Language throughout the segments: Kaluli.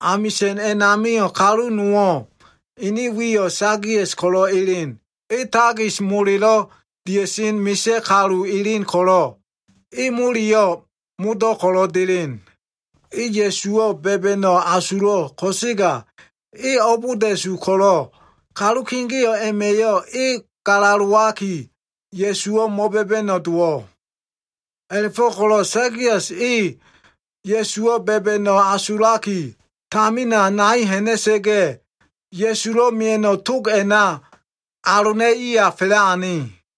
Amisa꞉n a꞉namio꞉ kalu nowo꞉, ene wiyo꞉ Sakias ko꞉lo꞉ elen. E takis molelo꞉ dia꞉sen misa꞉ kalu elen ko꞉lo꞉, e moleyo꞉ modo꞉ ko꞉lo꞉ delen. E Ya꞉suwo꞉ ba꞉ba꞉no꞉ asulo꞉ ko꞉sega e abolda꞉su ko꞉lo꞉, kalu kegeo꞉ a꞉ma꞉yo꞉ e galalowaki, Ya꞉suwo꞉ mo꞉ba꞉ba꞉no꞉ dowo꞉. A꞉la꞉fo꞉ko꞉lo꞉ Sakias e Ya꞉suwo꞉ ba꞉ba꞉no꞉ asulaki, tamina nai ha꞉na꞉sa꞉ga꞉, Ya꞉sulo꞉ mia꞉no꞉ tog a꞉na alona꞉iya fa꞉la꞉ ane.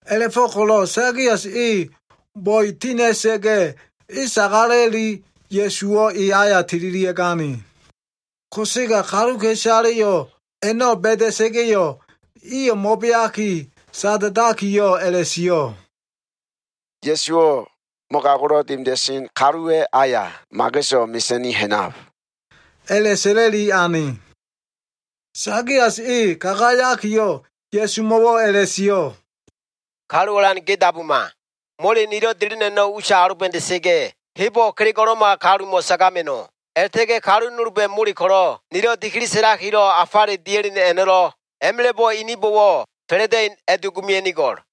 A꞉la꞉fo꞉ko꞉lo꞉ Sakias e bo꞉e tinda꞉sa꞉ga꞉, e sagala꞉liki Ya꞉suwo꞉ e aya tililia꞉gane. Ko꞉sega kaluka꞉isaleyo꞉ a꞉no꞉ ba꞉da꞉sa꞉ga꞉yo꞉, iyo꞉ mo꞉beaki, sada꞉dakiyo꞉ a꞉la꞉sio꞉, “Ya꞉suwo꞉ mogago꞉lo꞉ dimida꞉sen kaluwa꞉ aya mageso꞉ mesa꞉ni ha꞉nab” a꞉la꞉sa꞉la꞉li ane. Sakias e kagayakiyo꞉ Ya꞉sumo꞉wo꞉ a꞉la꞉sio꞉, “Kalu Alan, ge dabuma. Mole nilo꞉ delen a꞉no꞉ usa aloba꞉da꞉sa꞉ga꞉, hebo꞉ kelego꞉lo꞉ma kalumo꞉ sagama꞉no꞉. A꞉la꞉ta꞉ga꞉ kalu nolba꞉ mole ko꞉lo꞉ nilo꞉ dikili sa꞉lakilo꞉ afale dia꞉len a꞉no꞉, a꞉ma꞉la꞉bo꞉ ininbo꞉wo꞉ fa꞉la꞉da꞉in a꞉dugumia꞉nigo꞉l.”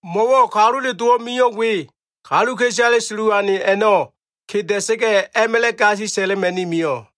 Mo꞉wo꞉ Kalule Dowo꞉ mio꞉ we, kaluka꞉isale sulu ane a꞉no꞉ keda꞉sa꞉ga꞉, a꞉ma꞉la꞉ gasi sa꞉la꞉ma꞉ni mio꞉.”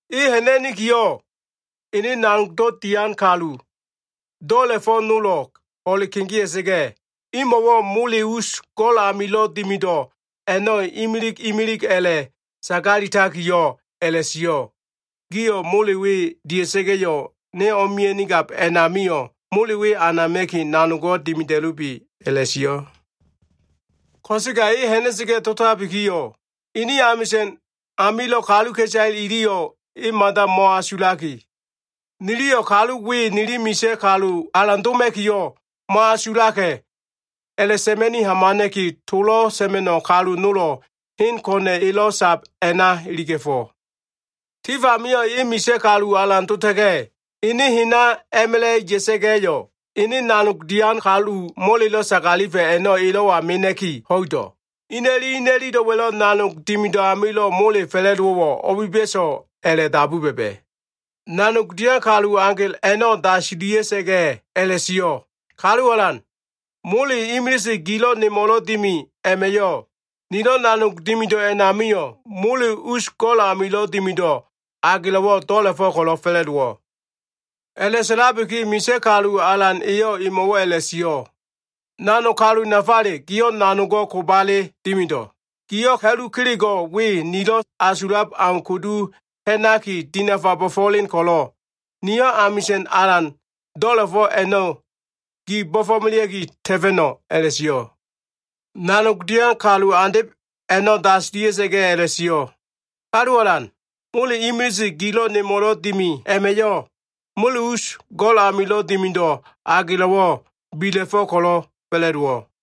E ha꞉na꞉nikiyo꞉, ene nanog dian kalu do꞉la꞉fo꞉ nolo꞉ ho꞉le kegea꞉sa꞉ga꞉yo꞉, imo꞉wo꞉ mole us go꞉l amilo꞉ dimido꞉ a꞉no꞉ imilig imilig a꞉la꞉ sagalitakiyo꞉ a꞉la꞉sio꞉, ‘Gio꞉ mole we dia꞉sa꞉ga꞉yo꞉, ne o꞉mia꞉nigab a꞉namio꞉ mole we anama꞉ki nanogo꞉ dimida꞉lubi’ a꞉la꞉sio꞉. Ko꞉sega e ha꞉na꞉sa꞉ga꞉ dotabikiyo꞉, ene amisa꞉n amilo꞉ kaluka꞉isale iliyo꞉ e mada mo꞉asulaki, ‘Niliyo꞉ kalu we nili misa꞉ kalu alan doma꞉kiyo꞉ mo꞉asulaka꞉’ a꞉la꞉sa꞉ma꞉ni hamana꞉ki, tolo꞉ sa꞉ma꞉no꞉ kalu nolo꞉ hen ko꞉na꞉ elo꞉ sab a꞉na iliga꞉fo꞉. Tif amio꞉ e misa꞉ kalu alan dota꞉ga꞉, ene hena a꞉ma꞉la꞉ ya꞉sa꞉ga꞉yo꞉, ene nanog dian kalu molelo꞉ sagalifa꞉ a꞉no꞉ elo꞉wa mena꞉ki ho꞉ido꞉. Ina꞉li ina꞉lilo꞉wa꞉lo꞉ nanog dimido꞉ amilo꞉ mole fa꞉la꞉dowo꞉wo꞉ o꞉biba꞉so꞉ a꞉la꞉dabu ba꞉ba꞉. “Nanog dian kalu agel a꞉no꞉ dasila꞉sa꞉ga꞉ a꞉la꞉sio꞉, ‘Kalu Alan, mole imilise gilo꞉ nemo꞉lo꞉ dimi a꞉ma꞉yo꞉ nilo꞉ nanog dimido꞉ a꞉namio꞉, mole us go꞉l amilo꞉ dimido꞉ agelo꞉wo꞉ do꞉la꞉fo꞉ ko꞉lo꞉ fa꞉la꞉dowo꞉.’ A꞉la꞉sa꞉labiki, misa꞉ kalu alan eyo꞉ emo꞉wo꞉ a꞉la꞉sio꞉, ‘Nanog kalu nafale giyo꞉ nanogo꞉ kobale dimido꞉. Giyo꞉ ha꞉lu kelego꞉ we nilo꞉ asulab au kudu ha꞉naki dinafa bo꞉fo꞉len ko꞉lo꞉, niyo꞉ amisa꞉n alan do꞉la꞉fo꞉ a꞉no꞉ gi bo꞉fo꞉melea꞉ki ta꞉fa꞉no꞉’ a꞉la꞉sio꞉. “Nanog dian kalu andeb a꞉no꞉ dasila꞉sa꞉ga꞉ a꞉la꞉sio꞉, ‘Kalu alan, mole imilise gilo꞉ nemo꞉lo꞉ dimi a꞉ma꞉yo꞉, mole us go꞉l amilo꞉ dimido꞉ agelo꞉wo꞉ bila꞉fo꞉ ko꞉lo꞉ fa꞉la꞉dowo꞉.’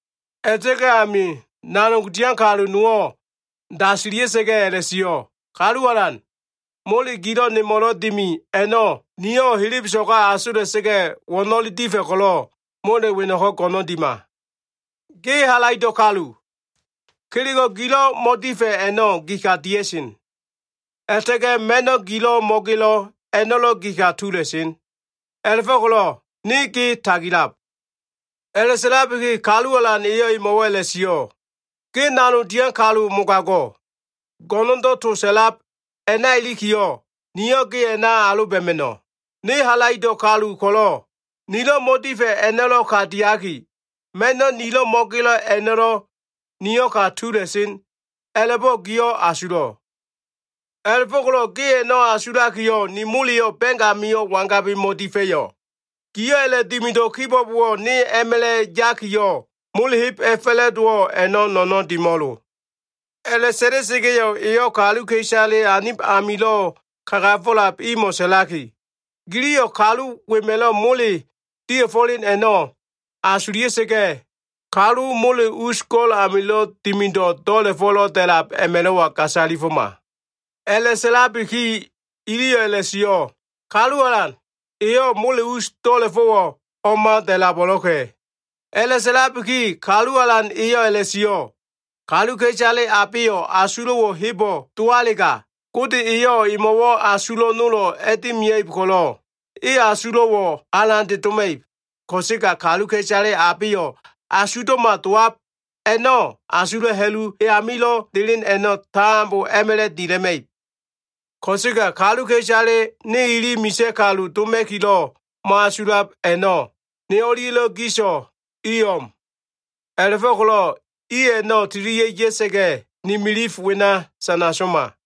“A꞉la꞉ta꞉ga꞉ ami, nanog dian kalu nowo꞉ dasila꞉sa꞉ga꞉ a꞉la꞉sio꞉, ‘Kalu alan, mole gilo꞉ nemo꞉lo꞉ dimi a꞉no꞉, niyo꞉ helebeso꞉ga asola꞉sa꞉ga꞉, wo꞉no꞉le difa꞉ ko꞉lo꞉ mole weno꞉ko꞉ go꞉no꞉n dima. Ge halaido꞉ kalu. Kelego꞉ gilo꞉ mo꞉difa꞉ a꞉no꞉ gi ka dia꞉sen. A꞉la꞉ta꞉ga꞉ ma꞉no꞉ gilo꞉ mo꞉gelo꞉ a꞉no꞉lo꞉, gi ka tula꞉sen. A꞉la꞉fo꞉ko꞉lo꞉ ne ge tagilab.’ A꞉la꞉sa꞉labiki kalu alan eyo꞉ emo꞉wo꞉ a꞉la꞉sio꞉, ‘Ge nanog dian kalu mogago꞉. Go꞉no꞉ndo꞉ to sa꞉lab a꞉na ilikiyo꞉, niyo꞉ ge a꞉na aloba꞉ma꞉no꞉. Ne halaido꞉ kalu ko꞉lo꞉, nilo꞉ mo꞉difa꞉ a꞉no꞉ ka diaki, ma꞉no꞉ nilo꞉ mo꞉gelo꞉ a꞉no꞉lo꞉, niyo꞉ ka tula꞉sen a꞉la꞉bo꞉ giyo꞉ asulo꞉. A꞉la꞉fo꞉ko꞉lo꞉ ge a꞉no꞉ asulakiyo꞉, ni moleyo꞉ ba꞉ng amio꞉ wangabi mo꞉difa꞉yo꞉? Giyo꞉ a꞉la꞉dimido꞉ kibo꞉bowo꞉, ne a꞉ma꞉la꞉ yakiyo꞉, mole heb a꞉fa꞉la꞉dowo꞉ a꞉no꞉ no꞉no꞉n dimo꞉lo.’ A꞉la꞉sa꞉la꞉sa꞉ga꞉yo꞉, eyo꞉ kaluka꞉isale anib amilo꞉ kagafo꞉lab imo꞉ sa꞉laki, ‘Giliyo꞉ kalu wema꞉lo꞉ mole dia꞉fo꞉len a꞉no꞉ asulia꞉sa꞉ga꞉, kalu mole us go꞉l amilo꞉ dimido꞉ do꞉la꞉fo꞉lo꞉ da꞉lab a꞉ma꞉lo꞉wa gasalifoma.’ A꞉la꞉sa꞉labiki iliyo꞉ a꞉la꞉sio꞉, ‘Kalu alan, eyo꞉ mole us do꞉la꞉fo꞉wo꞉ o꞉ma da꞉labo꞉lo꞉ka꞉.’ A꞉la꞉sa꞉labiki, Kalu alan eyo꞉ a꞉la꞉sio꞉, ‘Kaluka꞉isale abeyo꞉ asulo꞉wo꞉ hebo꞉ dowalega, Gode eyo꞉ emo꞉wo꞉ asulo꞉ nolo꞉ a꞉dimia꞉ib ko꞉lo꞉, e asulo꞉wo꞉ alande doma꞉ib. Ko꞉sega kaluka꞉isale abeyo꞉ asugdo꞉ma dowab a꞉no꞉, asulo꞉ ha꞉lu e amilo꞉ delen a꞉no꞉, tambo a꞉ma꞉la꞉ dila꞉ma꞉ib. Ko꞉sega kaluka꞉isale ne ili misa꞉ kalu doma꞉kilo꞉ mo꞉asulab a꞉no꞉, ne o꞉lia꞉lo꞉ giso꞉ i o꞉m. A꞉la꞉fo꞉ko꞉lo꞉ i a꞉no꞉ tililia꞉ ya꞉sa꞉ga꞉, ni milif wena sana soma.’”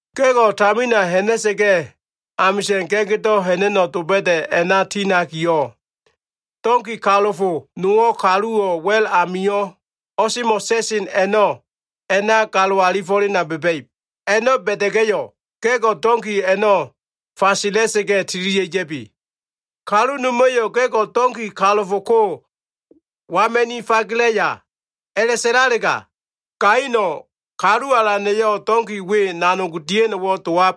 “Ga꞉go꞉ tamina ha꞉na꞉sa꞉ga꞉, amisa꞉n ga꞉gdo꞉ ha꞉na꞉no꞉ doba꞉da꞉ a꞉na ti ha꞉nakiyo꞉, donki kalofo nowo꞉ kaluwo꞉ wa꞉l a꞉namio꞉ o꞉semo꞉ sa꞉sen a꞉no꞉ a꞉na galo alifo꞉lena ba꞉ba꞉ib. A꞉no꞉ ba꞉da꞉ga꞉yo꞉, ga꞉go꞉ donki a꞉no꞉ fagela꞉sa꞉ga꞉, tililia꞉ ya꞉bi. Kalu noma꞉yo꞉ ‘Ga꞉go꞉ donki kalofo ko wagama꞉ni fagelaya?’ a꞉la꞉sa꞉lalega, gaino꞉ ‘Kalu Alana꞉yo꞉ donki we nanog dia꞉no꞉wo꞉ dowab’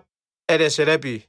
a꞉la꞉sa꞉la꞉bi.”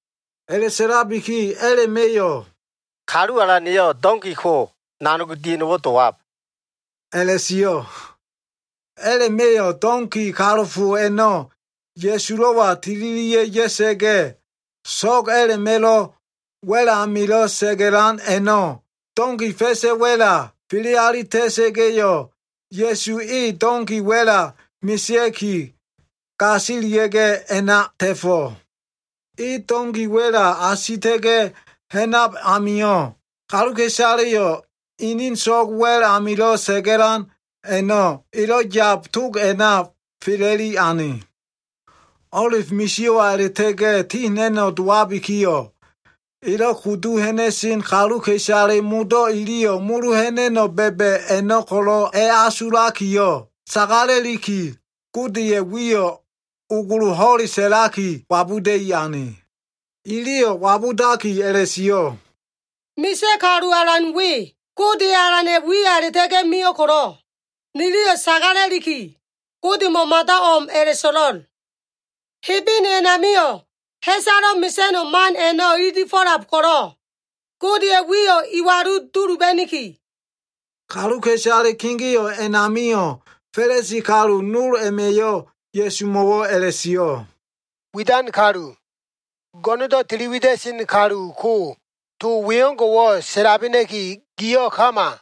A꞉la꞉sa꞉labiki a꞉la꞉ma꞉yo꞉, “Kalu alana꞉yo꞉ donki ko nanog dia꞉no꞉wo꞉ dowab” a꞉la꞉sio꞉. A꞉la꞉ma꞉yo꞉ donki kalofo a꞉no꞉ Ya꞉sulo꞉wa tililia꞉ ya꞉sa꞉ga꞉, so꞉g a꞉la꞉ma꞉lo꞉ wa꞉l amilo꞉ sa꞉ga꞉lan a꞉no꞉ donki fa꞉sa꞉ wa꞉la fele alita꞉sa꞉ga꞉yo꞉, Ya꞉su e donki wa꞉la mesea꞉ki, gasilia꞉ga꞉ a꞉na ta꞉fo꞉. E donki wa꞉la asita꞉ga꞉ ha꞉nab amio꞉, kaluka꞉isaleyo꞉ inin so꞉g wa꞉l amilo꞉ sa꞉ga꞉lan a꞉no꞉ elo꞉ yab tog a꞉na fela꞉li ane. O꞉lif misio꞉wa a꞉la꞉ta꞉ga꞉ ti ha꞉na꞉no꞉ dowabikiyo꞉, elo꞉ kudu ha꞉na꞉sen kaluka꞉isale modo꞉ iliyo꞉ molo ha꞉na꞉no꞉ ba꞉ba꞉ a꞉no꞉ ko꞉lo꞉ asulakiyo꞉, sagala꞉liki Godeya꞉ wiyo꞉ ogolo ho꞉le sa꞉laki wabuda꞉i ane. Iliyo꞉ wabudakiyo꞉ a꞉la꞉sio꞉, “Misa꞉ kalu alan we, Gode Alana꞉ wiya a꞉la꞉ta꞉ga꞉ mio꞉ ko꞉lo꞉, niliyo꞉ sagala꞉liki, Godemo꞉ mada o꞉m a꞉la꞉so꞉lo꞉l. Hebene a꞉namio꞉ ha꞉salo꞉ mesa꞉no꞉ man a꞉no꞉ ililifo꞉lab ko꞉lo꞉, Godeya꞉ wiyo꞉ iwalu duluba꞉niki.” Kaluka꞉isale kegeo꞉ a꞉namio꞉ Fa꞉lisi kalu nol a꞉ma꞉yo꞉ Ya꞉sumo꞉wo꞉ a꞉la꞉sio꞉, “Widan kalu, go꞉no꞉ndo꞉ tili wida꞉sen kalu ko to wengo꞉wo꞉ sa꞉labena꞉ki giyo꞉ kama!”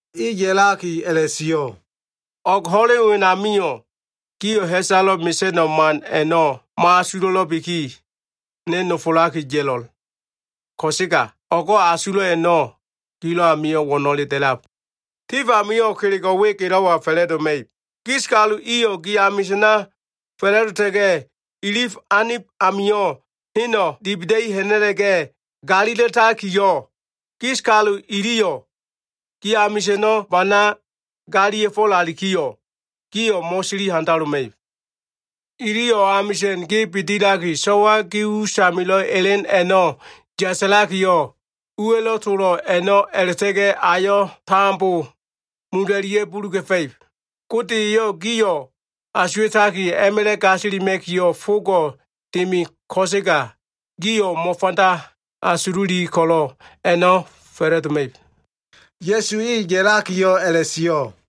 E ya꞉laki a꞉la꞉sio꞉, “O꞉g ho꞉len wenamio꞉ gio꞉ ha꞉salo꞉ mesa꞉no꞉ man a꞉no꞉ mo꞉asulo꞉lo꞉biki, ne nofolaki ya꞉lo꞉l. Ko꞉sega o꞉go꞉ asulo꞉ a꞉no꞉ gilo꞉ amio꞉ wo꞉no꞉le da꞉lab. Tif amio꞉ kelego꞉ we gelo꞉wa fa꞉la꞉doma꞉ib. Gis kalu iyo꞉ gi amisa꞉na fa꞉la꞉dota꞉ga꞉, ilif anib amio꞉ heno꞉ dibida꞉i ha꞉na꞉la꞉ga꞉ galila꞉takiyo꞉, gis kalu iliyo꞉ gi amisa꞉no꞉ bana galila꞉fo꞉lalikiyo꞉, gio꞉ mo꞉sili handaloma꞉ib. Iliyo꞉ amisa꞉n ge bidilaki, so꞉wa gi usamilo꞉ elen a꞉no꞉lo꞉ yasalakiyo꞉, uwa꞉lo꞉ tolo꞉ a꞉no꞉ a꞉la꞉ta꞉ga꞉ ayo꞉ tambo mula꞉lia꞉ga꞉ buluga꞉fa꞉ib. Gode eyo꞉ gio꞉ asuwa꞉taki a꞉ma꞉la꞉ gasilima꞉kiyo꞉ fogo꞉ dimi ko꞉sega gio꞉ mo꞉fanda asululi ko꞉lo꞉ a꞉no꞉ fa꞉la꞉doma꞉ib.” Ya꞉su e ya꞉lakiyo꞉ a꞉la꞉sio꞉.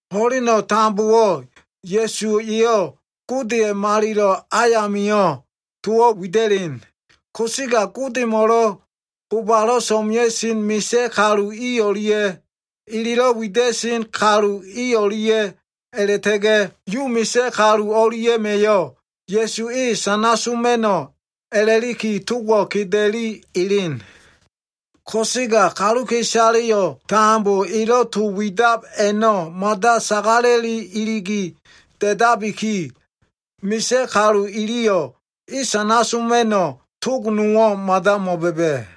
Ho꞉leno꞉ tambowo꞉ Ya꞉su eyo꞉ Godeya꞉ malilo꞉ ayamio꞉ towo꞉ wida꞉len. Ko꞉sega Godemo꞉lo꞉ bobalo꞉ so꞉mea꞉sen misa꞉ kalu i o꞉lia꞉, elelo꞉ wida꞉sen kalu i o꞉lia꞉, a꞉la꞉ta꞉ga꞉ Yu misa꞉ kalu i o꞉lia꞉ma꞉yo꞉ Ya꞉su e sana soma꞉no꞉ a꞉la꞉liki togo꞉ keda꞉li elen. Ko꞉sega kaluka꞉isaleyo꞉ tambo elo꞉ to widab a꞉no꞉ mada sagala꞉li iligi da꞉dabiki, misa꞉ kalu iliyo꞉ e sana soma꞉no꞉ tog nowo꞉ mada mo꞉ba꞉ba꞉.